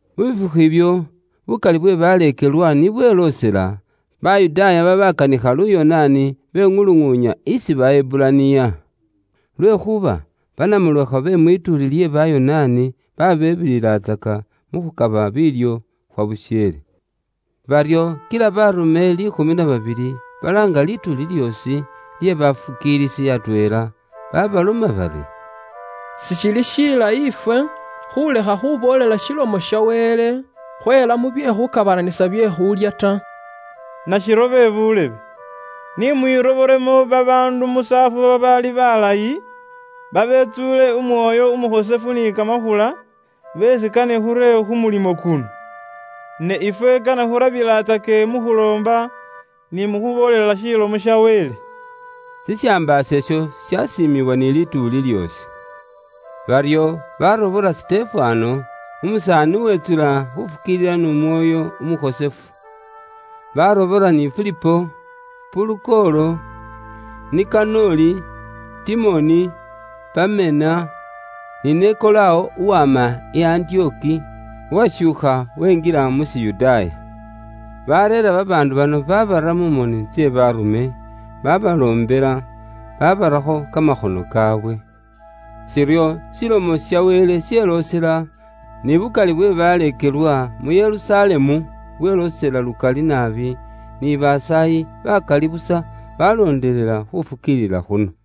Mu bifukhu ibyo, bukali bwe baleekelwa ni bweloosela, Bayudaaya babaakanikha Luyonaani beŋuluŋuunya isi ba Heburaniya. Lwekhuuba banamulekhwa be mwituuli lye Bayonaani baabebililatsaka mu khukaba biilyo khwa busheele. Baryo kila baarume liikhumi na babili balaanga lituuli lyoosi lye baleekelwa atweela, babaloma bari, “Sishili shilayi ifwe khuulekha khuboolela Ilomo ya Wele, khweela mubye khukhwakaanisa bye khulya ta. Nashiryo be buulebe, ni mwirobolemo babaandu musaafu babaali balayi, babetsuule Umwoyo Umukhosefu ni kamakhula, beesi kane khure khu mulimo kuno. Ne ifwe kane khurabilatsake mu khuloomba, ni mu khuboolela Ilomo ya Wele.” Shishambaaso isho shasiimibwa ni lituuli lyoosi. Baryo baarobola Sitefano, umusaani uwetsula khufukiilila n'Umwoyo Umukhosefu. Baarobola ni Filipo, Purukolo, Nikanoli, Timoni, Pamena, ni Nikolawo uwama i Antiyoki, uwashuukha winjila mu Shiyudaaya. Bareera babaandu bano babara mu moni tse baarume, babaloombela, babarakho kamakhono kaawe. Shiryo Ilomo ya Wele yeloosela, ni bukali bwe baleekelwa mu Yerusalemu bweloosela lukali naabi, ni basaayi bakali busa baaloondelela khufukiilila khuno.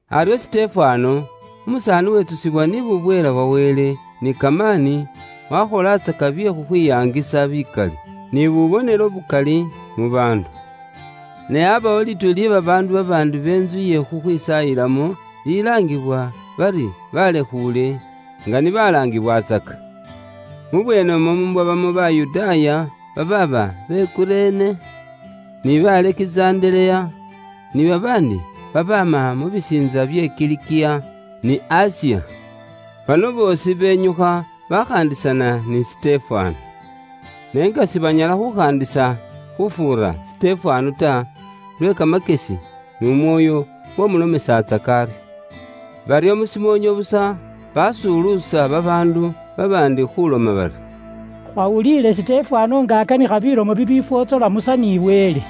Aryo Sitefano, umusaani uwetsusibwa ni bubweela bwa Wele ni kamaani, waakholatsaka bye khukhwiyaangisa bikali, ni bubonelo bukali mu baandu. Ne aabawo lituuli lye babaandu babaandi bentsu iye khukhwisaayilamo lilaangibwa bari Balekhuule (nga ni balaangiwatsaka). Mubweenemwo mwabamo Bayudaaya babaaba be Kurene, nibe Alekizandereya, ni babaandi babaama mu bisiintsa bye Kilikiya, ni Asiya. Bano boosi benyukha bakhaandisana ni Sitefano. Ne nga sibanyala khukhaandisana khufuura Sitefano ta, lwe kamakyesi n'Umwoyo uwamulomesatsaka aryo. Baryo mushimoonyo busa, baasuluusa babaandu babaandi khuuloma bari, “Khwawuliile Sitefano nga akanikha bilomo bibifwotsola Musa ni Wele.”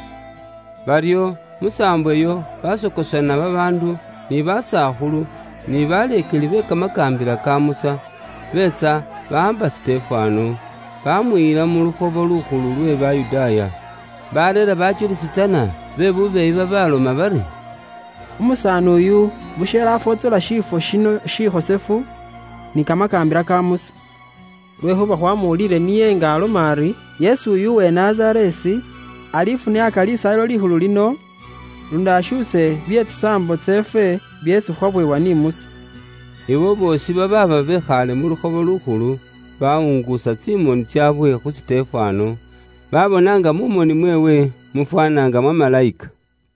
Baryo musaambo iyo baasokosana babaandu ni basakhulu, ni baleekeli be kamakaambila ka Musa, beetsa bawaamba Sitefano, baamuyila mu lukhobo lukhulu lwe Bayudaaya. Baareera bajulisi tsana be bubeeyi babaloma bari, “Umusaaniyu busheele afwotsola shiifwo shino shikhosefu, ni kamakaambila ka Musa. Lwekhuuba khwamuwuliile niye nga aloma ari, ‘Yesu uyu uwe Nazareesi, alifuniaaka Lisaayilo Likhulu lino, luundi ashuuse bye tsisaambo tseefwe byeesi khwaweebwa ni Musa.’” Abo boosi babaaba bekhaale mu lukhobo lukhulu, bawunguusa tsimoni tsaabwe khu Sitefano, baabona nga mu moni mweewe mufwaana nga mwa malayika.